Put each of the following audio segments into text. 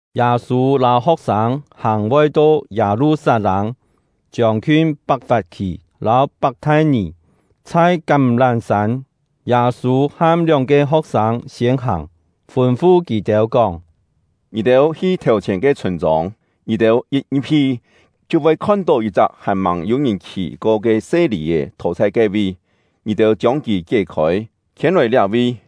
Yâ-sû lâu ho̍k-sâng hàng voi to Yâ-lu-sat-lâng, chiông-khiun Pak-fap-khì lâu Pak-thai-nì, chhai Kám-lám-sân, Yâ-sû ham lióng-ke ho̍k-sâng siên hàng, fûn-fu kì-têu kóng: “Ngì-têu hi thèu-chhièn ke chhûn-chông. Ngì-têu yit ngi̍p-hi, chhiu voi khon-tó yit-chak hàn-màng yû-ngìn khì-ko ke se lì-è thò chhai ke-vi. Ngì-têu chiông kì kié-khôi, khiên-lòi liá-vi.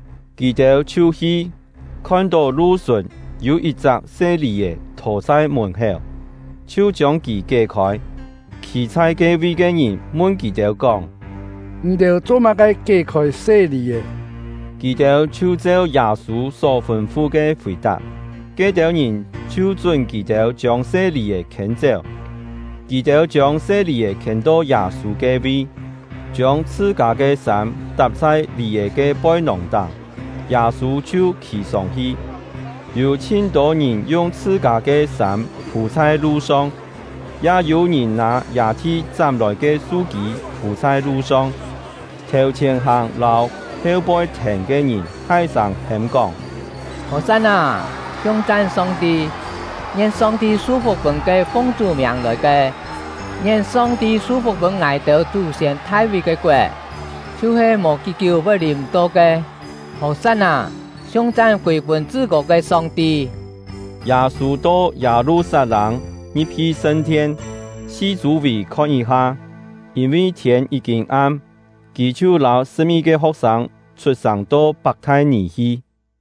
Kì-têu chhiu hi, khon-tó lu-sùn yû yit-chak se lì-è thò chhai mùn-héu, chhiu chiông kì kié-khôi. Khî chhai ke-vi ke ngìn mun kì-têu kóng: “Ngì-têu cho-má-ke kié-khôi se lì-è?” Kì-têu chhiu cheu Yâ-sû só fûn-fu ke fì-tap; ke-têu ngìn chhiu chún kì-têu chiông se lì-è khiên-chéu. Kì-têu chiông se lì-è khiên-to Yâ-sû ke-vi, chiông chhṳ-kâ ke sâm tap chhai lì-è ke poi-nòng-táng, Yâ-sû chhiu khì sông-hi. Yû chhin-tô ngìn yung chhṳ-kâ ke sâm phû chhai lu-song, ya yû-ngìn nâ yâ-thi chám-lòi ke su-kî phû chhai lu-song. Thèu-chhièn hàng lâu heu-poi thèn ke ngìn thai-sâng hêm-kóng: “Hò-san-nâ! Siung-chan Song-ti! Ngien Song-ti su-fuk pûn ke fung Chú miàng lòi ke! Ngien Song-ti su-fuk pûn ngài-têu chú-siên Thai-ví ke koet, chhiu-he mò kí-kiú voi lìm-to ke! Hò-san-nâ! Siung-chan kûi-pûn Chṳ-kô ke Song-ti!” Yâ-sû to Yâ-lu-sat-lâng, ngi̍p-hi sṳn-thien, si chû-vì khon yit-ha. Yîn-vi thiên yí-kîn am, kì chhiu lâu sṳ̍p-ngi-ke ho̍k-sâng chhut-sàng to Pak-thai-nì hi.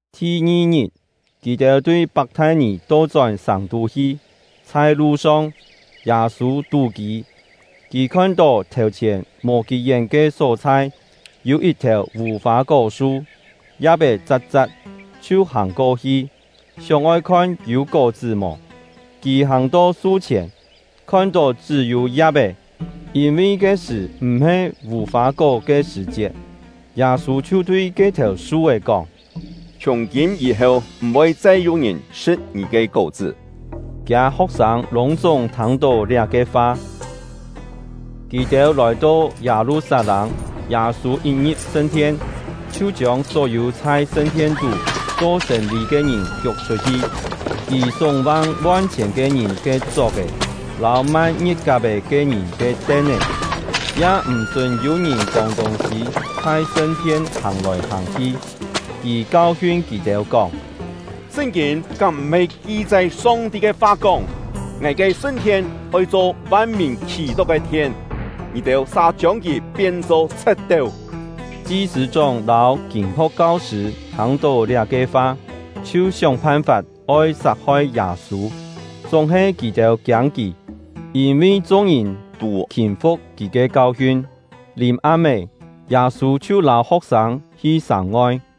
Thi-ngi-ngit, kì-têu tui Pak-thai-nì to-chón sàng-tú hi; chhai lu-song, Yâ-sû tú-kî. Kì khon-tó thèu-chhièn mò kí-yén ke só-chhai yû yit-thèu vù-fâ-kó-su, ya̍p-é cha̍t-cha̍t, chhiu hàng-ko-hi, sióng-oi khon yû kó-chṳ́ mò. Kì hàng-to su-chhièn, khon-tó chṳ́-yû ya̍p-é, yîn-vi ke-sṳ̀ m̀-he vù-fâ-kó ke sṳ̀-chiet. Yâ-sû chhiu tui ke-thèu su-é kóng: “Chhiùng-kîm yî-heu, m̀-voi chai yû-ngìn sṳ̍t ngì ke kó-chṳ́!” Kiâ ho̍k-sâng lûng-chúng thâng-tó liá-ke fa. Kì-têu lòi-to Yâ-lu-sat-lâng, Yâ-sû yit ngi̍p sṳn-thien chhiu chiông só-yû chhai sṳn-thien-tú cho sên-lî ke ngìn kiuk chhut-hi. Kì súng-vang von-chhièn ke ngìn ke chok-è lâu mai ngie̍t-kap-è ke ngìn ke ten-é, ya m̀-chún yû-ngìn kông tûng-sî chhai sṳn-thien hàng-lòi hàng-hi. Kì kau-hiun kì-têu kóng: “Sṳn-kîn kám m̀-he ki-chai Song-ti ke fa kóng: ‘Ngài ke sṳn-thien oi cho van-mìn khì-tó ke thien’, ngì-têu sa chiông kì pien-cho chhe̍t-teu!” Chi-sṳ̂-chóng lâu kîn-ho̍k kau-sṳ̂ thâng-tó liá-ke fa, chhiu sióng phan-fap oi sat-hoi Yâ-sû. Chúng-he kì-têu kiâng kì, yîn-vi chung-ngìn tû khîm-fu̍k kì ke kau-hiun. Lìm-am-é, Yâ-sû chhiu lâu ho̍k-sâng hi sàng-ngoi.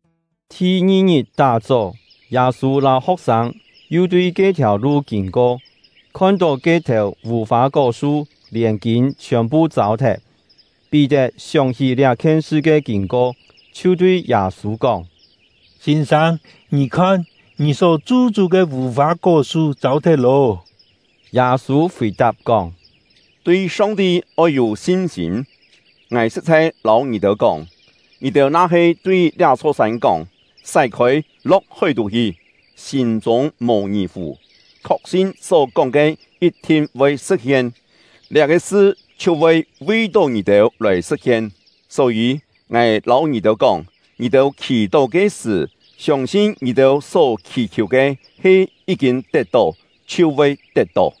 Thi-ngi-ngit tá-chó, Yâ-sû lâu ho̍k-sâng yu tui ke-thiàu lu kîn-ko, khon-tó ke-thèu vù-fâ-kó-su lièn kîn chhiòn-phu châu-thet. Pí-tet sióng-hí liá-khien sṳ ke kîn-ko, chhiu tui Yâ-sû kóng: “Sîn-sâng, ngì khon, ngì só chu-chú ke vù-fâ-kó-su châu-thet lô.” Yâ-sû fì-tap kóng: “Tui Song-ti oi yû sin-sîm! Ngài sṳ̍t-chhai lâu ngì-têu kóng, ngì-têu na-he tui liá-chho sân kóng: ‘Sái-khôi, lo̍k hói-tú hi!’ sîm-chûng mò ngì-fù, khok-sin só kóng ke yit-thin voi sṳ̍t-hien, liá-ke sṳ chhiu voi vi-tó ngì-têu lòi sṳ̍t-hien. Só-yî, ngài lâu ngì-têu kóng, ngì-têu khì-tó ke sṳ̀, siông-sin ngì-têu só khiù ke he yí-kîn tet-tó, chhiu voi tet-tó.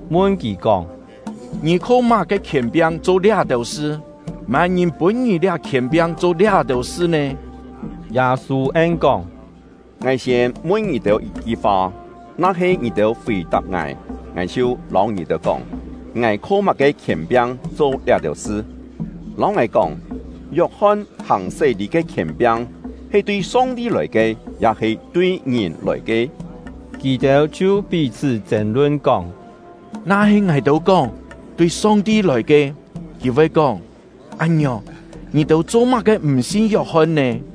mun kì kóng: “Ngì kho má-ke khièn-piang cho liá-têu sṳ? Má-ngìn pûn ngì liá khièn-piang cho liá-têu sṳ nè?” Yâ-sû en-kóng: “Ngài siên mun ngì-têu yit-ki fa, na-he ngì-têu fì-tap ngài, ngài chhiu lâu ngì-têu kóng, ngài kho má-ke khièn-piang cho liá-têu sṳ. Lâu ngài kóng, Yok-hon hàng sé-lî ke khièn-piang, he tui Song-ti lòi ke, ya-he tui ngìn lòi ke?” Kì-têu chhiu pí-chhṳ́ chên-lun, kóng: “Na-he ngài-têu kóng: ‘Tui Song-ti lòi ke’, kì voi kóng: ‘Án-ngiòng, ngì-têu cho-má-ke m̀ sin Yok-hon nè?’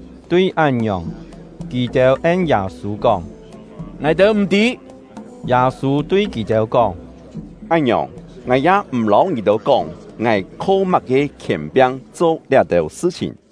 Tui án-ngiòng, kì-têu en Yâ-sû kóng: “Ngài-têu m̀ tî.” Yâ-sû tui kì-têu kóng: “Án-ngiòng, ngài ya m̀ lâu ngì-têu kóng ngài kho má-ke khièn-piang cho liá-têu sṳ-chhìn.”